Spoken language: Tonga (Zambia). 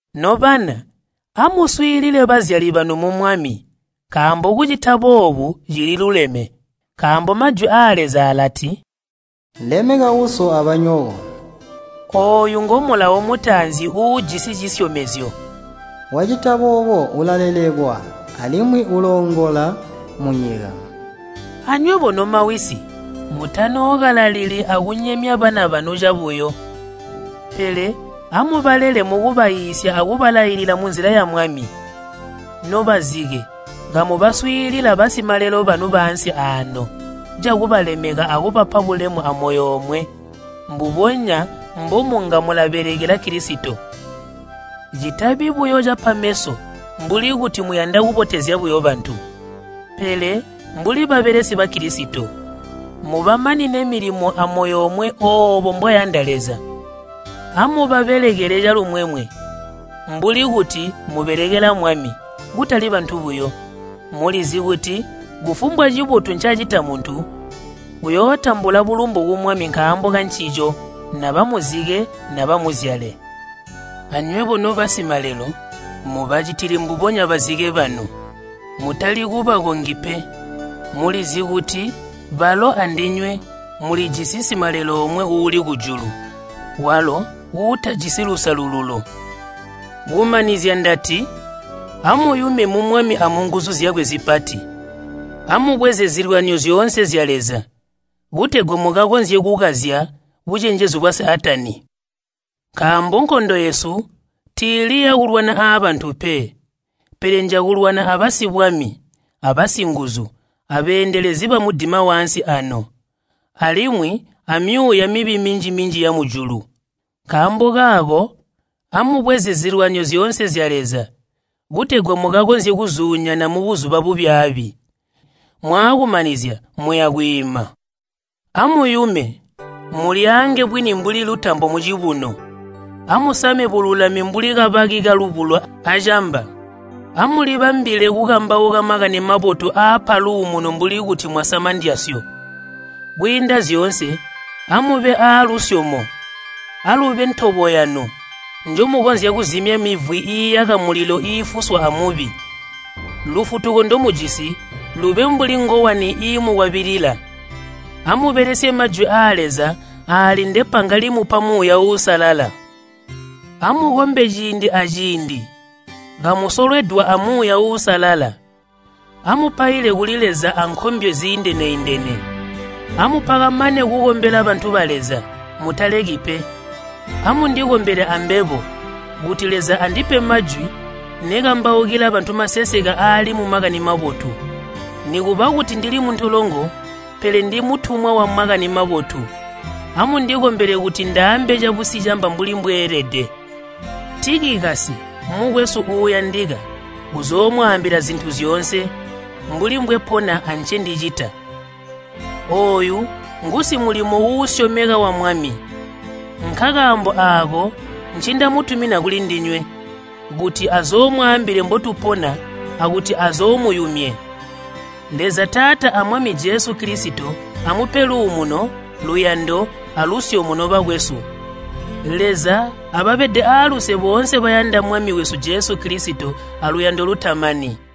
Nobana, amuswiilile bazyali banu mu Mwami, nkaambo kucita boobu cililuleme. Nkaambo Majwi aa Leza alati, “Lemeka uso abanyoko.” (Ooyu ngo mulawo mutaanzi uujisi cisyomezyo.) “Wacita boobo, ulalelekwa, alimwi uloongola munyika.” Anywebo nomawisi, mutanookalalili akunyemya bana banu cabuyo, pele amubalele mukubaiisya akubalailila munzila ya Mwami. Nobazike, kamubaswiilila basimalelo banu baansi aano, cakubalemeka akubapa bulemu amoyo omwe, mbubonya mbomunga mulabelekela Kilisito. Citabi buyo cipa meso mbuli kuti muyanda kubotezya buyo bantu. Pele mbuli babelesi ba Kilisito, mubamanine milimo amoyo omwe oobo mbwayanda Leza. Amubabelekele calumwemwe, mbuli kuti mubelekela Mwami, kutali bantu buyo. Mulizi kuti kufumbwa cibotu ncacita muntu, uyootambula bulumbu ku Mwami nkaambo kancico, naba muzike naba muzyale. Anywebo nobasimalelo, mubacitile mbubonya bazike banu. Mutali kubakongi pe. Mulizi kuti balo andinywe mulijisi simalelo omwe uuli kujulu, walo uutajisi lusalululo. Kumanizya ndati, amuyume mu Mwami amunguzu zyakwe zipati. Amubweze zilwanyo zyoonse zya Leza, kutegwa mukakonzye kukazya bucenjezu bwa Saatani. Nkaambo nkondo yesu tiili yakulwana aabantu pe, pele njakulwana abasibwami, abasinguzu, abeendelezi bamudima waansi ano, alimwi amyuuya mibi minji-minji yamujulu. Nkaambo kaako amubweze zilwanyo zyoonse zya Leza, kutegwa mukakonzye kuzuunyana mubuzuba bubyaabi, mwaakumanizya muya kwiima. Amuyume, mulyaange bwini mbuli lutambo mucibuno. Amusame bululami mbuli kabaki kalubulo acamba. Amulibambilile kukambauka Makani Mabotu aapa luumuno mbuli kuti mwasama ndyasyo. Kwiinda zyoonse amube aalusyomo, alube ntobo yanu, njomukonzya kuzimya mivwi iiyaka mulilo iifuswa a Mubi. Lufutuko ndomujisi lube mbuli ngowani iimukwabilila. Amubelesye majwi aa Leza aali ndepanga limupa Muuya Uusalala. Amukombe ciindi aciindi kamusolwedwa a Muuya Uusalala. Amupaile kuli Leza ankombyo ziindene-indene. Amupakamane kukombela bantu ba Leza, mutaleki pe. Amundikombele ambebo kuti Leza andipe majwi nekambaukila bantu maseseke aali mu Makani Mabotu. Nikuba kuti ndili muntolongo, pele ndi mutumwa wa Makani Mabotu. Amundikombele kuti ndaaambe cabusicamba mbuli mbweelede. Tikikasi, mukwesu uuyandika uzoomwaambila zintu zyoonse, mbuli mbwepona ancendicita. Ooyu ngusimulimo uusyomeka wa Mwami. Nkakaambo aako ncindamutumina kulindinywe, kuti azoomwaambile mbotupona akuti azoomuyumye. Leza Taata a Mwami Jesu Kilisito amupe luumuno, luyando, alusyomo, nobakwesu. Leza ababede aaluse boonse bayanda Mwami wesu Jesu Kilisito aluyando lutamani.